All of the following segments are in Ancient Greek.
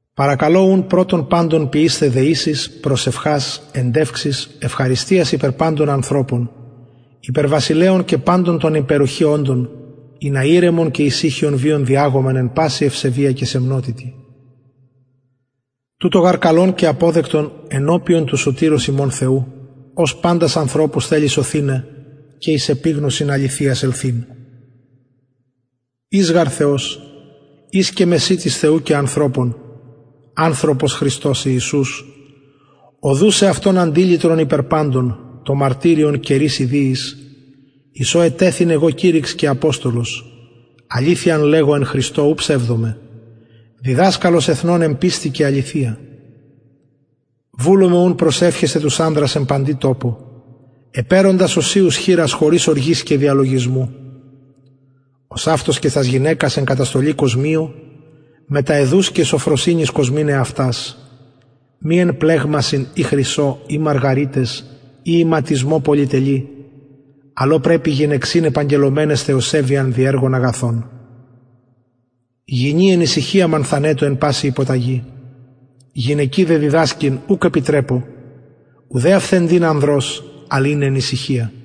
παρακαλω ουν πρωτον παντων ποιεισθαι δεησεις προσευχας εντευξεις ευχαριστιας υπερ παντων ανθρωπων υπερ βασιλεων και παντων των εν υπεροχη οντων ινα ηρεμον και ησυχιον βιον διαγωμεν εν παση ευσεβεια και σεμνοτητι τουτο γαρ καλον και αποδεκτον ενωπιον του σωτηρος ημων θεου ος παντας ανθρωπους θελει σωθηναι και εις επιγνωσιν αληθειας ελθειν εις γαρ θεος εις και μεσιτης θεου και ανθρωπων ανθρωπος χριστος ιησους ο δους εαυτον αντιλυτρον υπερ παντων το μαρτυριον καιροις ιδιοις εις ο ετεθην εγω κηρυξ και αποστολος αληθειαν λεγω εν χριστω ου ψευδομαι διδασκαλος εθνων εν πιστει και αληθεια βουλομαι ουν προσευχεσθαι τους ανδρας εν παντι τοπω επαιροντας οσιους χειρας χωρις οργης και διαλογισμου ωσαυτως και τας γυναικας εν καταστολη κοσμιω μετα αιδους και σωφροσυνης κοσμειν εαυτας μη εν πλεγμασιν η χρυσω η μαργαριταις η ιματισμω πολυτελει αλλ ο πρεπει γυναιξιν επαγγελλομεναις θεοσεβειαν δι εργων αγαθων γυνη εν ησυχια μανθανετω εν παση υποταγη γυναικι δε διδασκειν ουκ επιτρεπω ουδε αυθεντειν ανδρος αλλ ειναι εν ησυχια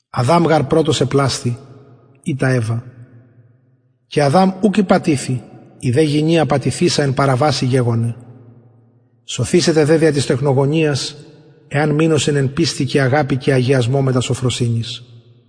αδαμ γαρ πρωτος επλασθη ειτα ευα και αδαμ ουκ ηπατηθη η δε γυνη απατηθεισα εν παραβασει γεγονεν σωθησεται δε δια της τεκνογονιας εαν μεινωσιν εν πιστει και αγαπη και αγιασμω μετα σωφροσυνης